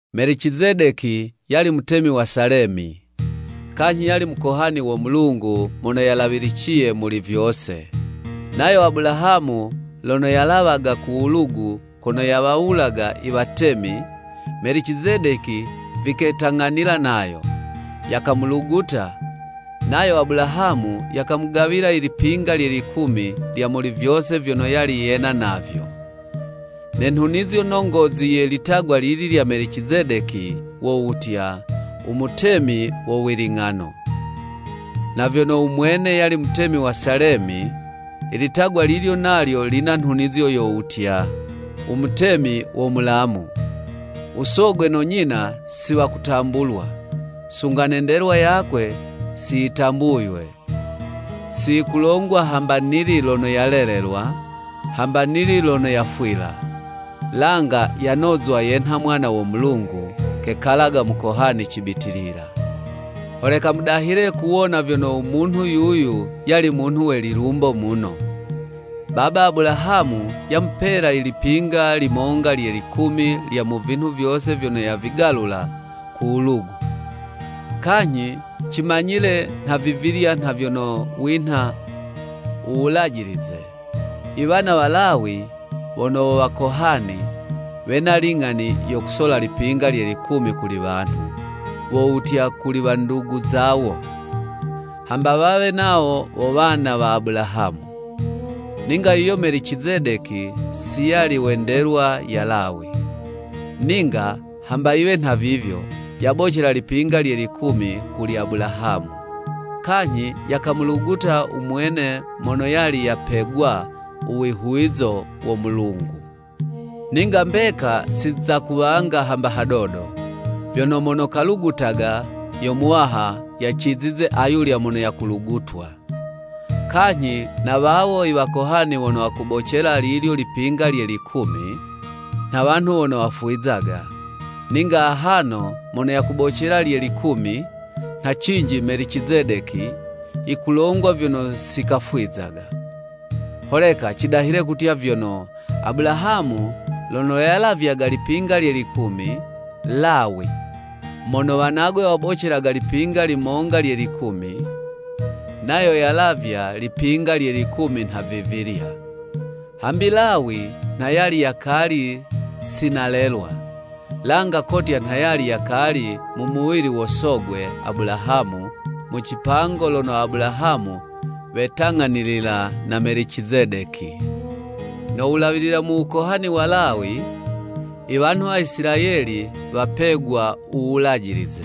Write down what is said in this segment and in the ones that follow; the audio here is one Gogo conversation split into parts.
Melicizedeki yali mutemi wa Salemi, kanyhi yali Mukohani wo Mulungu Mono Yalawiliciye Muli Vyose. Nayo Abulahamu lono yalawaga ku wulugu kono yawawulaga i watemi, Melicizedeki viketang'anila nayo, yakamuluguta, nayo Abulahamu yakamugawila i lipinga lye likumi lya muli vyose vyono yali yena navyo. (Ne nhunizo nongozi ye litagwa lili lya Melicizedeki, wo wutya, “U mutemi wo wiling'ano,” na vyono u mwene yali mutemi wa Salemi, ilitagwa lilyo nalyo lina nhunizo yo wutya, “U mutemi wo Mulamu.”) U sogwe no nyina si wakutambulwa, sunga ne ndelwa yakwe si yitambuywe, si yikulongwa hamba nili lono yalelelwa, hamba nili lono yafwila. Langa yanozwa yenha Mwana wo Mulungu, kekalaga Mukohani cibitilila. Holeka mudahile kuwona vyono u munhu yuyu yali munhu we lilumbo muno. Baba Abulahamu yamupela i lipinga limonga lye likumi lya mu vinhu vyose vyono yavigalula ku wulugu. Kanyhi cimanyile nhavivilya nha vyono winha u wulajilize, i wana wa Lawi wono wo Wakohani, wena ling'ani yo kusola lipinga lye likumi kuli wanhu, wo wutya kuli wandugu zawo, hamba wawe nawo wo wana wa Abulahamu. Ninga yuyo Melicizedeki si yali we ndelwa ya Lawi, ninga hamba yiwe nhavivyo, yabocela lipinga lye likumi kuli Abulahamu, kanyhi yakamuluguta u mwene mono yali yapegwa u wihuwizo wo Mulungu. Ninga mbeka si za kuwanga hamba hadodo, vyono mono kalugutaga yo muwaha yacizize ayulya mono yakulugutwa. Kanyhi na wawo i wakohani wono wakubocela lilyo lipinga lye likumi, nha wanhu wono wafwizaga, ninga ahano mono yakubocela lye likumi, nha cinji Melicizedeki, yikulongwa vyono si kafwizaga. Holeka cidahile kutya vyono, Abulahamu lono yalavyaga lipinga lye likumi, Lawi, (mono wanagwe wabocelaga lipinga limonga lye likumi) nayo yalavya, lipinga lye likumi nhavivilya. Hambi Lawi nha yali yakali si nalelwa, langa kotya nha yali yakali mu muwili wo sogwe Abulahamu, mu cipango lono Abulahamu wetang'anilila na Melicizedeki. No wulawilila mu wukohani wa Lawi, i wanhu wa Isilayeli wapegwa u Wulajilize.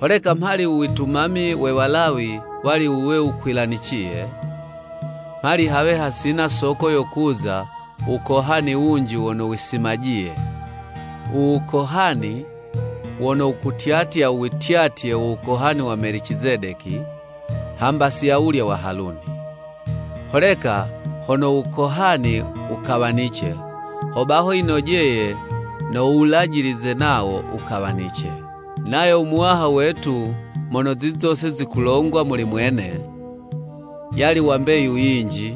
Holeka mhali u witumami we Walawi wali wuwe wukwilaniciye, mhali hawe hasina soko yo kuza u wukohani wunji wono wisimajiye, u wukohani wono wukutyatya u wityatye wo wukohani wa Melicizedeki, hamba si awulya wa Haluni. Holeka hono u wukohani wukawanice, hobaho yinojeye no Wulajilize nawo wukawanice. Nayo u Muwaha wetu mono zizi zose zikulongwa muli mwene, yali wa mbeyu yinji,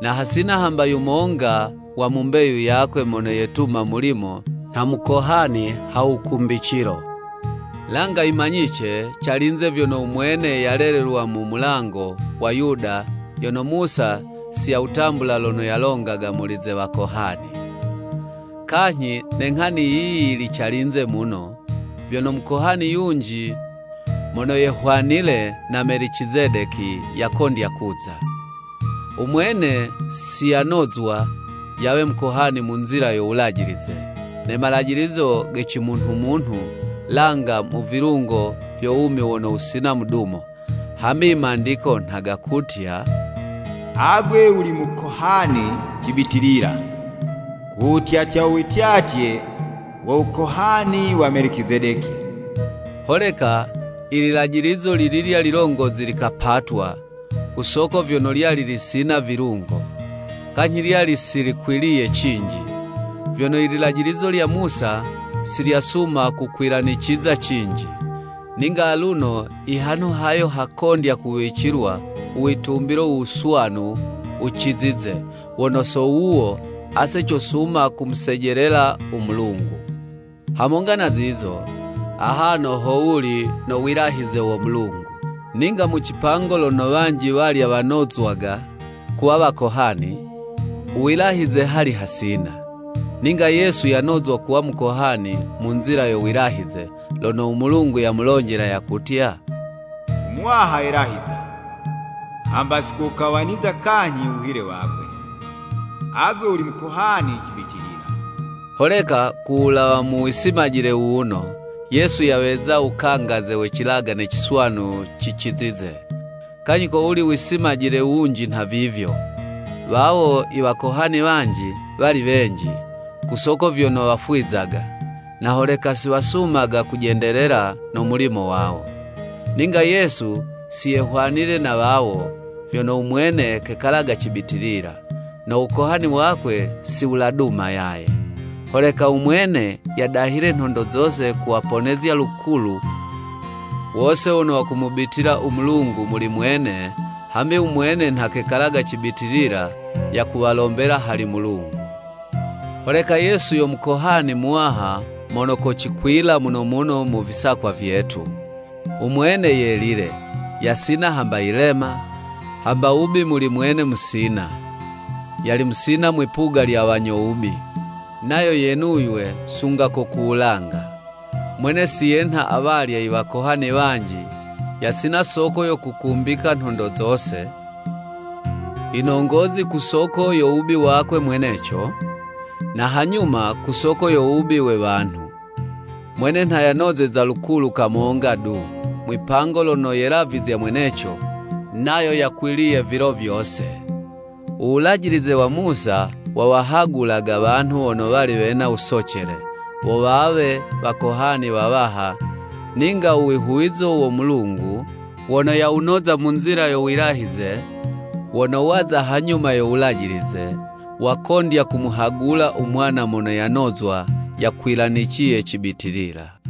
na hasina hamba yumonga wa mu mbeyu yakwe mono yetuma mulimo nha mukohani ha wukumbicilo. Langa yimanyice calinze vyono u mwene yalelelwa mu mulango wa Yuda yono Musa si yawutambula lono yalongaga muli ze wakohani. Kanyhi ne nghani yiyi yili calinze muno, vyono mukohani yunji mono yehwanile na Melicizedeki yakondya kuza. U mwene si yanozwa yawe mukohani mu nzila yo wulajilize ne malajilizo ge cimunhumunhu, langa mu vilungo vyo wumi wono wusina mudumo. Hambi i Mandiko nha gakutya: “Agwe wuli mukohani cibitilila ku wutyatya u wityatye wo wukohani wa Melicizedeki.” Holeka i lilajilizo lililya lilongozi likapatwa, ku soko vyono lyali lisina vilungo, kanyhi lyali si likwiliye cinji. Vyono i lilajilizo lya Musa si lyasuma kukwilaniciza cinji. Ninga aluno i hanhu hayo, hakondya kuwicilwa u witumbilo u wuswanu wucizize, wono so wuwo, ase cosuma kumusejelela u Mulungu. Hamonga na zizo, ahano ho wuli no wilahize wo Mulungu. Ninga mu cipango lono wanji walya wanozwaga kuwa wakohani, u wilahize hali hasina. Ninga Yesu yanozwa kuwa mukohani mu nzila yo wilahize, lono u Mulungu yamulonjela yakutya, “U Muwaha yelahiza hamba si kowukawaniza kanyhi u wuhile wakwe. Agwe wuli mukohani cibitilila.” Holeka ku wulawa mu wisimajile wuwuno, Yesu yaweza wukangaze we cilagane ciswanu cicizize. Kanyhi kowuli wisimajile wunji nhavivyo, wawo i wakohani wanji, wali wenji, ku soko vyono wafwizaga, na holeka si wasumaga kujendelela no mulimo wawo. Ninga Yesu si yehwanile na wawo, vyono u mwene kekalaga cibitilila, no wukohani wakwe si wuladuma yaye. Holeka u mwene, yadahile nhondo zose kuwaponezya lukulu wose wono wakumubitila u Mulungu muli mwene, hambi u mwene nha kekalaga cibitilila yakuwalombela hali Mulungu. Holeka Yesu yo Mukohani Muwaha mono kocikwila muno muno mu visakwa vyetu. U mwene Yelile, yasina hamba yilema, hamba wubi muli mwene musina, yali musina mwipuga lya wanyo wubi, nayo yenuywe sunga ko ku wulanga. Mwene si yenha awalya i wakohani wanji, yasina soko yo kukumbika nhondo zose, yinongozi ku soko yo wubi wakwe mweneco, na hanyuma ku soko yo wubi we wanhu. Mwene nha yanozeza lukulu kamonga du, mwipango lono yelavizya mweneco, nayo yakwiliye vilo vyose. U Wulajilize wa Musa, wawahagulaga wanhu wono wali wena wusocele, wo wawe wakohani wawaha, ninga u wihuwizo wo Mulungu, wono yawunoza mu nzila yo wilahize, wono waza hanyuma yo Wulajilize, wakondya kumuhagula u Mwana mono yanozwa yakwilaniciye cibitilila.